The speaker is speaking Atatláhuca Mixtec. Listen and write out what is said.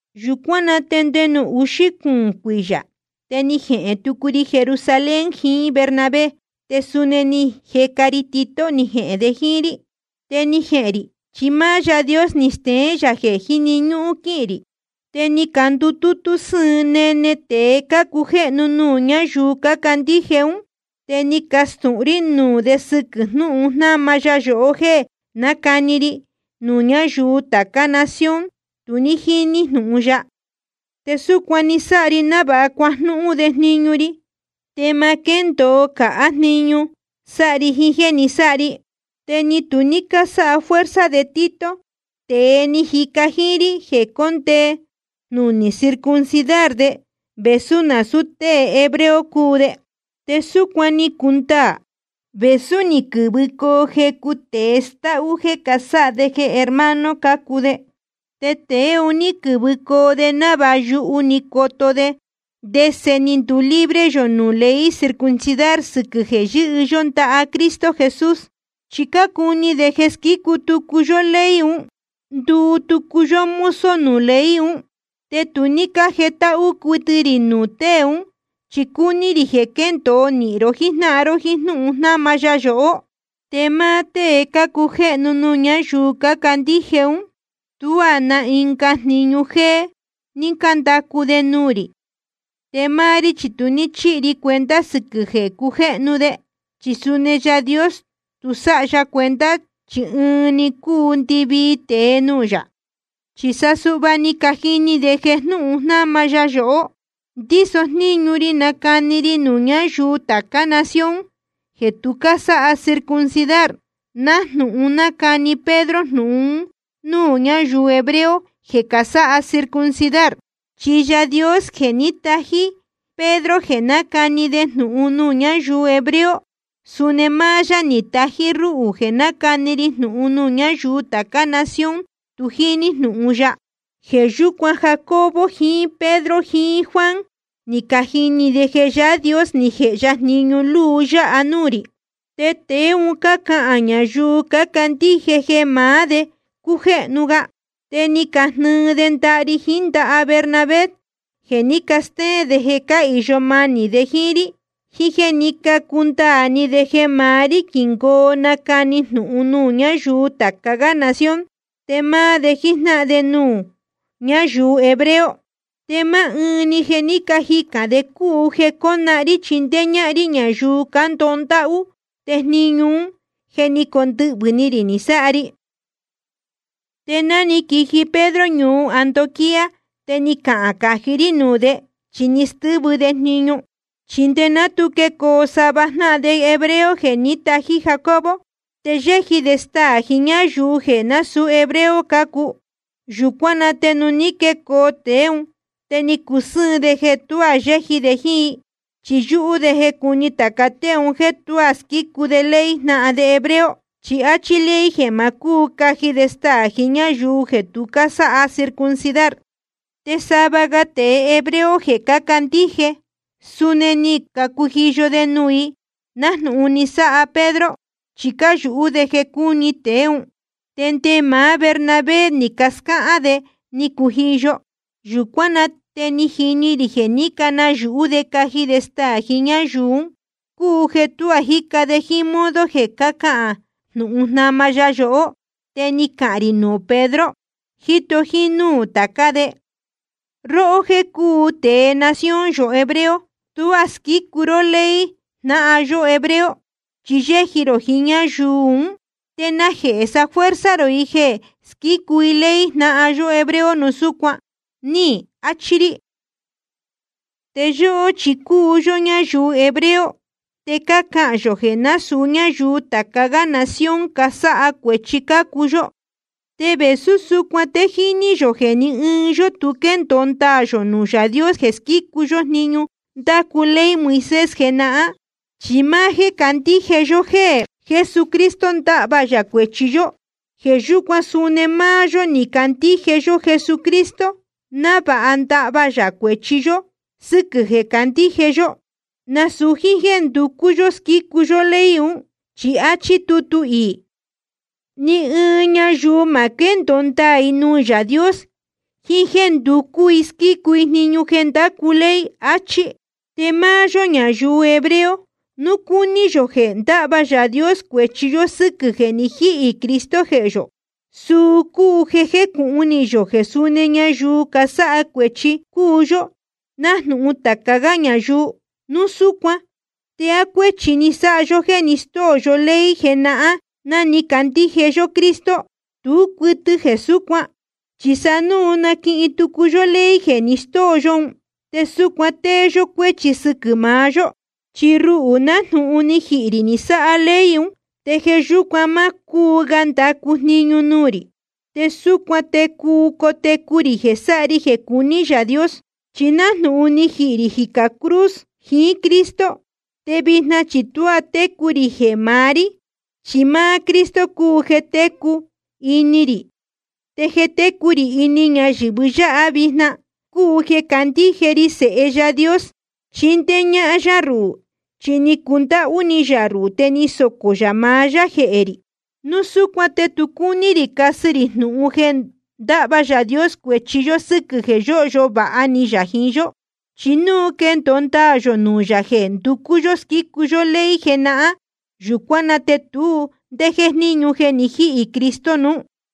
Yūcuán na te nde nuū uxí cuūn cuiyā, te ni jehēn tucu ri Jerusalén jiín Bernabé, te suni ni jeca ri Tito ni jehēn de jíín rí. Te ni jehēn rī chi máá Yaā Dios ni steén yā jeē jíni ñúhún quíhīn rī. Te ni candutútú sɨ́ɨn nene tēe cácujéhnu nuū ñáyuu cácandíje ún. Te ni castūhun rí nuū de sɨquɨ̄ jnúhun jnáma ya yohó jéē nácani ri nuū ñáyuu tācá nación tu jíní jnūhun ya. Te súcuan ni sáha ri návāha cuajnúhún de jniñu ri, te ma quéndōo cāhá jniñu sáha ri jiín jéē ni sáha ri. Te ni tu ní cásáha fuerza de Tito, tēe ni jica jíín rí, jeē cóndee jnunī circuncidar de, vēsú nasūu tée hebreo cúu de. Te súcuan ni cundaā, vēsú ni quɨ̄vɨcoo jecu tēe stáhú jéē sáha de jeē hermano cácuu de. Te tēe un ní quɨ̄vɨcoo de návāha yuhu‑ni coto de ndese ni ndulibre yō nuū ley circuncidar sɨquɨ̄ jeē yɨ́hɨ yó ndaha Cristo Jesús. Chi cácuni de jeē squícu tucu yó ley un, nduu tucu yó mozo nuū ley un. Te tu ní cájetáhú cuɨtɨ rī nuū tée ún, chi cúní rī jeē quéndōo nīhin ró jíjnáhan ró jíín jnúhun jnáma ya yohó. Te máá tée cácujéhnu nuū ñáyuu cácandíje ún, tuá na ɨnga jniñu jéé ní cándacu de nuū rī. Te máá rí chi tu ní chíhi ri cuenta sɨquɨ̄ jeē cácujéhnu de, chi suni Yaā Dios tu sáha ya cuenta, chi ɨnuú‑ni cúu ndɨvii tēe nuū yā. Chi sa suhva ni cajini de jeē jnúhun jnáma ya yohó, ndíso jníñu ri nacani ri nuū ñáyuu tācá nación jeē tu cásáha circuncidar, nájnūhun nácani Pedro jnūhun un núū ñáyuu hebreo jeē casáha circuncidar. Chi Yaā Dios jeē ní tají Pedro jeē nácani de jnūhun nuū ñáyuu hebreo, suni máá yá ni tají rúhū jeē nácani ri jnūhun nuū ñáyuu tācá nación tu jíní jnūhun ya. Jeē yúcuan, Jacobo jiín Pedro jiín Juan, ni cajini de jeē Yaā Dios ni jēhe ya jniñu luu yáha nuū rī. Te tēe un cácahān ñayuu cácandíje jeē maá de cácujéhnu ga. Te ni cajnɨɨ de ndaha ri jiín ndaha Bernabé, jeē ní castéén de jeē cáhīyo manī de jíín rí, jiín jéē ní cacundaā ni de jeē maá rí quingōo nacani jnūhun nuū ñáyuu tāca gá nación, te máá de jíjnáhan de nuū ñáyuu hebreo. Te máá ɨɨn‑ni jeē ní cajicān de cúu jeē cónahán rí chindéé ñáhán rí ñayuu cándoho ndáhú, te jniñu ún je ni condɨhvɨ̄ ni rī ni sáha ri. Te ná ni quiji Pedro ñuu Antioquía, te ni cahān cají rí nuū de, chi ni stɨ́vɨ de jniñu. Chi nde ná tu quecoo sava jnáhan de hebreo jeē ní tají Jacobo, te yéji de staā jiín ñáyuu jeē násūú hebreo cácuu. Yūcuán na te nuū ní quecoo tēe ún, te ni cusɨ́ɨn de jeē tuá yéji de jíín i, chi yúhú de jeē cúni tāca tée un jéē tuá squícu de ley jnáhan de hebreo. Chi áchí ley jeē ma cúu caji de staā jiín ñáyuu jeē tu cásáha circuncidar. Te sava ga tēe hebreo jeē cácandíje, suni ni cacujiyo de nuū i, nájnūhun ni sáha Pedro, chi cáyūhú de jeē cúni tēe ún. Te nde máá Bernabé ni cascáhán de ni cujiyo. Yūcuán na te ni jini rī jeē ní canayūhú de caji de staā jiín ñáyuu ún, cúu jeē tuá jíca de jíín modo jeē cahán jnūhun jnáma ya yohó. Te ni cahān rī nuū Pedro, jíto jínúū tācá de: Róhó jéē cúu tēe nación yō hebreo, tuá squícu ró ley jnáhan yó hebreo, chi yéji rō jiín ñáyuu ún. ¿Te najehē safuerza rō i jeē squícu i ley jnáhan yo hebreo núu súcuan? ni achi rī. Te yóhó chi cúu yó ñáyuu hebreo, te cácahān yō jeē násūu ñáyuu tāca gá nación casáha cuēchi cácuu yó. Te vēsú súcuan te jíní yō jeē ní ɨɨn yó tu quéndōo ndaā yō nuū Yaā Dios jeē squícu yó jniñu ndácu ley Moisés jenahán, chi máá jéē candíje yó jeē Jesucristo ndahva yā cuēchi yó. Jeē yúcuan suni máá yó ni candíje yó Jesucristo, návāha ndahva yā cuēchi yó sɨ́quɨ̄ jeē candíje yó, nasūu jíín jéē nducú yó squícu yó ley un. Chi áchí tutu iī: Ni ɨɨn ñayuu ma quéndōo ndaā i nuū Yaā Dios jiín jéē nducú i squícu i jniñu jeē ndácu ley, achí. Te máá yó ñayuu hebreo, núu cúní yō jeē ndahva Yaā Dios cuēchi yó sɨ́quɨ̄ jeē ni jíhī Cristo jehē yō, suu cúu jeē jécūhun ni yō jeē suni ñayuu casáha cuēchi cúu yó, nájnūhun tāca gá ñayuu. Núu súcuan ¿te á cuéchi ni sáha yó jeē ni stóo yó ley jenahán ná ni candíje yó Cristo? Tú cuɨtɨ jeē súcuan. Chi sa núu naquihin tucu yó ley jeē ni stóo yó un, te súcuan tée yó cuéchi sɨquɨ̄ maá yó. Chi ruhū, nájnūhun ni jihī rī ni sáha ley un, te jeē yúcuan má cúu ga ndacu jniñu nuū rī. Te súcuan te cuu cotecu rī jeē sáha ri jeē cuní Yaā Dios. Chi nájnūhun je ni jihī rī jicā cruz jiín Cristo, te vijna chi tuá técu rī jeē maá rí, chi máá Cristo cúu jeē técu ini rī. Te jeē técu rī ini ñayɨ̄vɨ yáha vijna cúu jeē candíje ri jeē Sēhe Yaā Dios chindéé ñáhán yá ruhū. Chi ni cundáhú ni yā ruhū te ni socō yā maá yá jehē rī. Núu súcuan te tu cúní rī casɨ rī nuū jnúhun jeē ndáhva Yaā Dios cuēchi yó sɨ́quɨ̄ jeē yóhyo vāha ni yā jiín yó. Chi núu jeē quéndōo ndaā yō nuū yā jeē nducú yó squícu yó ley jenahán, yūcuán na te tu ndé jéjníñu jeē ni jíhī Cristo nuú.